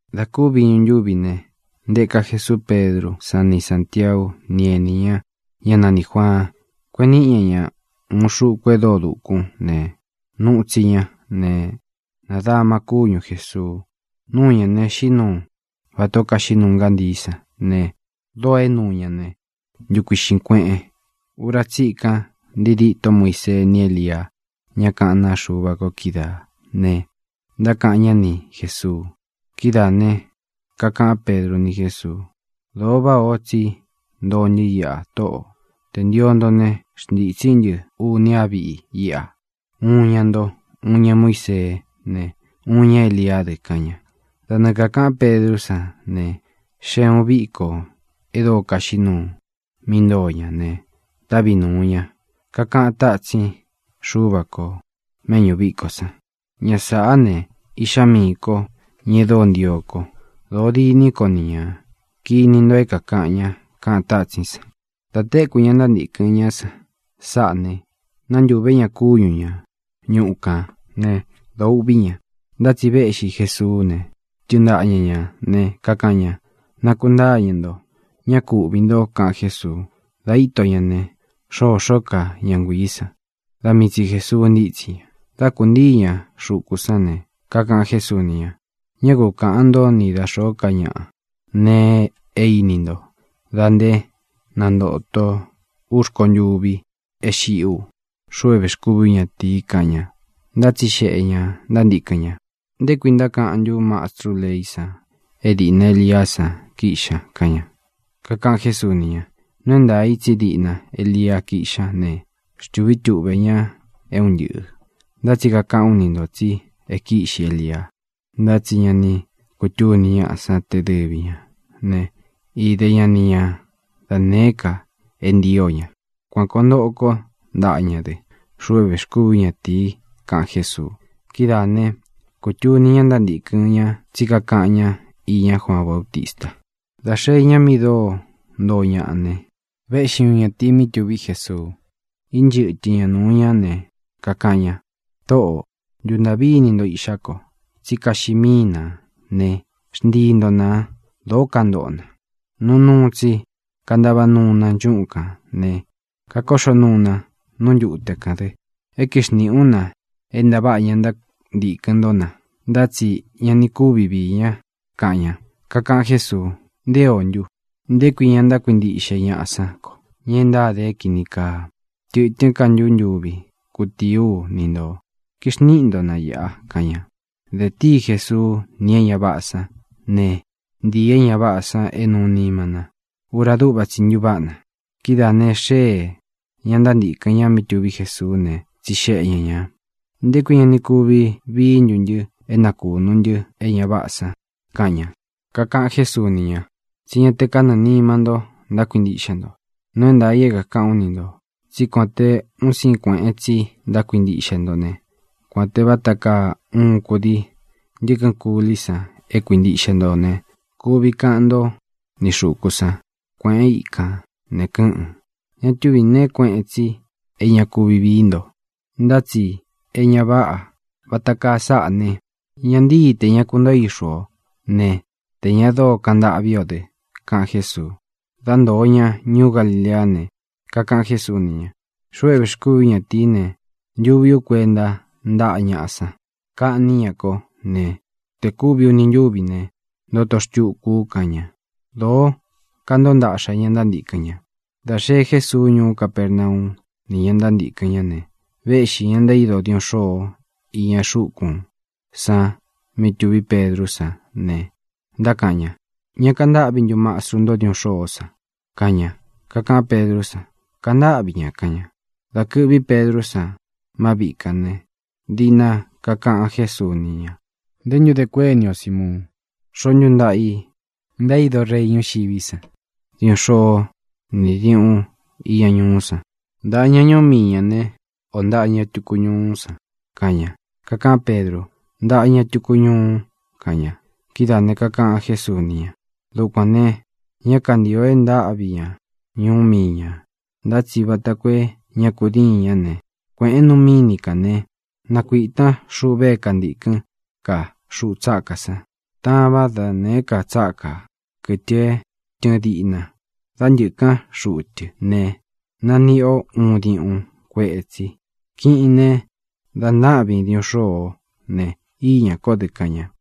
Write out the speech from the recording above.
Dā kúvi iñu ntúvi ne, ntēká Jesuu Pedrú san ni Sāntiau, ni ení ña, ñá nanī Juaan, kueꞌen níꞌi ña ña ūun xuku e dóo dūkún ne, nuu tsi ña ne, nadama kúñu Jēsuu. Nuu ña ne, xiꞌí nuu vatā ó kaxiꞌí nuu ngántii san ne, dóō é nuu ñā né, ntukuiꞌxīn kueꞌen. Ura tsíkan ntii dîtó Muisee ni Élia, ñá kaꞌán naa Xuva ko kídaā ne, ntákaꞌan ñá ni Jēsuu. Kidáā ne, kakaꞌán Pedru ni Jésuu: —Dōo váꞌā o tsí ntoo ntɨ́ iꞌa, Tóꞌō. Tē ntio nto ne, xntītsí ntɨ uni á viꞌi íꞌa, uun iña nto, uun iña Muísee ne, uun iña Éliá dɨ —kaꞌan ña. Da nɨɨ kākaꞌán Pedrú san ne, xée ūun viko e dóo kaxiꞌí nuu mí ntoo ña ne, távi nūu ña. Kakaꞌan tátsin Xúva kō méꞌñū vikó san: —Ña sāꞌá ne, Iꞌxá miī kó, ña e dóo ntio ko. Dōo diní ko ni ñā. Kini nto é kākaꞌan ña —kaꞌan tátsín san. Dā téku ña ntántīkɨn ñá san sáꞌā ne, nántūvé ña kúñu ña ñuꞌu kān né, dōo uꞌví ña. Ntá tsi véꞌxi Jēsuú ne, tɨɨn ntaꞌa ña ñā ne, kakaꞌan ña: —¡Nakuntáñɨ̄ nto! ¡Ñá ku uꞌvī nto! —kaꞌan Jésuu. Dā íto ña ne, xōxó ka ña nguiī san. Da mii tsi Jēsuu ntítsi ña. Dá kūntíi ña xuku sán ne, kakaꞌan Jésuu ni ña: —Ñá ku kaꞌān ntó ni da xōó ka ñaꞌa nee e íni nto da nté nantōto ú rkontûvi é xiꞌí u, xuꞌu é vēxkúvi ú ñatīi —kaꞌan ña. Ntátsixeꞌē ña ntántīkɨn ña: —¿Nté kui ntákaꞌán ntu mastrú leí san é dīꞌna Eliá san kíꞌxi ña? —kaꞌan ña. Kakaꞌan Jésuu ni ña: —Nuu é ntaā i tsí diꞌna Elia kíꞌxi ña ne, xtūví tuꞌvē ña é un ntɨꞌɨ̄. Ntá tsi kakaꞌán u ni ntō tsi e kíꞌxi Elia, ntá tsi ña ni kutúni ñáꞌa san te dɨvi ñā né, ide ña ni ña da nēé ka é ntio ña. Kuan kōo ntoꞌo kó ntaꞌa ña dɨ, xuꞌu é vēxkúvi ú ñatīi —kaꞌan Jésuu. Kidáā ne, kutuni ña ntántīkɨn ña tsí kakaꞌan ñá iña Juaan Baútista. Dā xeé ña mi dóo ntoo ñaꞌa ne, véꞌxi uun ñatīi mí tuví Jesuu. Ínchɨtɨ ña nūu ñá ne, kakaꞌan ña: —Tōꞌó, ntuntāꞌví ini nto iꞌxá ko, tsí kaxiꞌi míi nā ne, xntii nto nā. Dōó kantoꞌo na. Nuu nuu tsi kantava nuu na nchúꞌun kān ne, kakoꞌxó nuu na nú ntute kān dɨ. E kíxniꞌi ú na é ntāváꞌa ña ntántīkɨn ntó na, ntá tsi ña ni kuvi vií ña —kaꞌan ña. Kakaꞌan Jésuu: —¡Nté o ntu! ¿Nté kui ña ntákuintiꞌxe ñaꞌa sán ko, ña e ntáde é kīni kaa? ¿Tɨ̄tɨ́n ka ntu ntuvi kutíi ú ni ntō? Kixníꞌi nto na īꞌa —kaꞌan ña. De tíi Jesuu ni é ña váꞌā san ne, ntīi é ña váꞌā san é nuu nima na. Ura dúꞌva tsi ntuváꞌa na. Kidáā ne, xéē ña ntántīkɨn ña mí tuví Jesuú ne, tsixeꞌe ña ñā: —¿Nté kui ña ni kuvi vií ntu ntɨ é nakūnu ntɨ́ e ña váꞌā san? —kaꞌan ña. Kakaꞌan Jésuu ni ña: —Tsí ña te kanɨɨ̄ nima ntó ntákuintiꞌxe nto. Nuu é ntaā i é kākaꞌán u ni ntō tsí kuān te un síin kueꞌen tsi ntákuintiꞌxe nto ne, kuān te vata kaa uun kudii ntɨkɨn kulí san é kuintiꞌxe nto ne, kuvi kaꞌan ntó ni xūku san: “Kuēꞌén ikān”, ne, kɨ́ꞌɨ̄n. Ña túvī neé kueꞌen tsi é ña kuvi vií nto. Ntá tsi e ña váꞌa vāta kaa sáꞌa ne, ña ntíi tē ña kuntóo ixu ō né, tē ña dóo kaꞌan ntâꞌví ō dɨ —kaꞌan Jésuu. Dá ntoo ña ñuú Galileá ne, kakaꞌan Jésuu ni ña: —Xuꞌu é vēxkúvi ú ñatīí ne, ntuvi ú kuenta ntáꞌa ñaꞌa san. Kaꞌní ña kó ne, te kūvi uni ntúvi ne, ntoto xtuku u —kaꞌan ña. Dōo kántoo ntaꞌxa ña ntántīkɨn ña. Dā xee Jésuu ñuú Capernau ni ña ntántīkɨn ñá ne, véꞌxi ña ntaído diuꞌun xôo iña xúkūn san mí tuví Pedrú san ne, ntákaꞌan ña: —¿Ña kantáꞌvi ntu mastru ntó diuꞌun xôó san? —kaꞌan ña. Kakaꞌán Pedrú san: —Kantáꞌvi ña —kaꞌan ña. Dā kɨ́ꞌvi Pedrú san má viꞌi kān ne, diꞌna kakaꞌan Jésuu ni ña: —¿Nté ntu de kuéni o, Simuun? ¿Xoó ntu ntaꞌa i ntaído rei ñúxiví san diuꞌun xôó ni diūꞌun iña ñuꞌú san? ¿Ntaꞌa ña ñuú mii ñā né, ō ntaꞌa ña tuku ñuú san? —kaꞌan ña. Kakaꞌán Pedru: —Ntaꞌa ña tuku ñuu —kaꞌan ña. Kidáā ne, kakaꞌan Jésuu ni ña: —Dukuān ne, ñá kantio é ntáꞌvi ña ñuú mii ñā. Ntá tsi vata koo é ña kudíin ña ne, kueꞌēn nu míni kān ne, nakuitan xuꞌve é kantīkɨn kaa xuꞌu tsákā san. Tavan da nēé ka tsákā, kɨtɨ é tɨɨn diꞌna. Dá ntɨ̄kán xuꞌu tɨ ne, naníꞌi o uun diuꞌun kuetsi. Kiꞌin ne, da ntaꞌvin diuꞌun xôo ó ne, íñā kó dɨ —kaꞌan ña.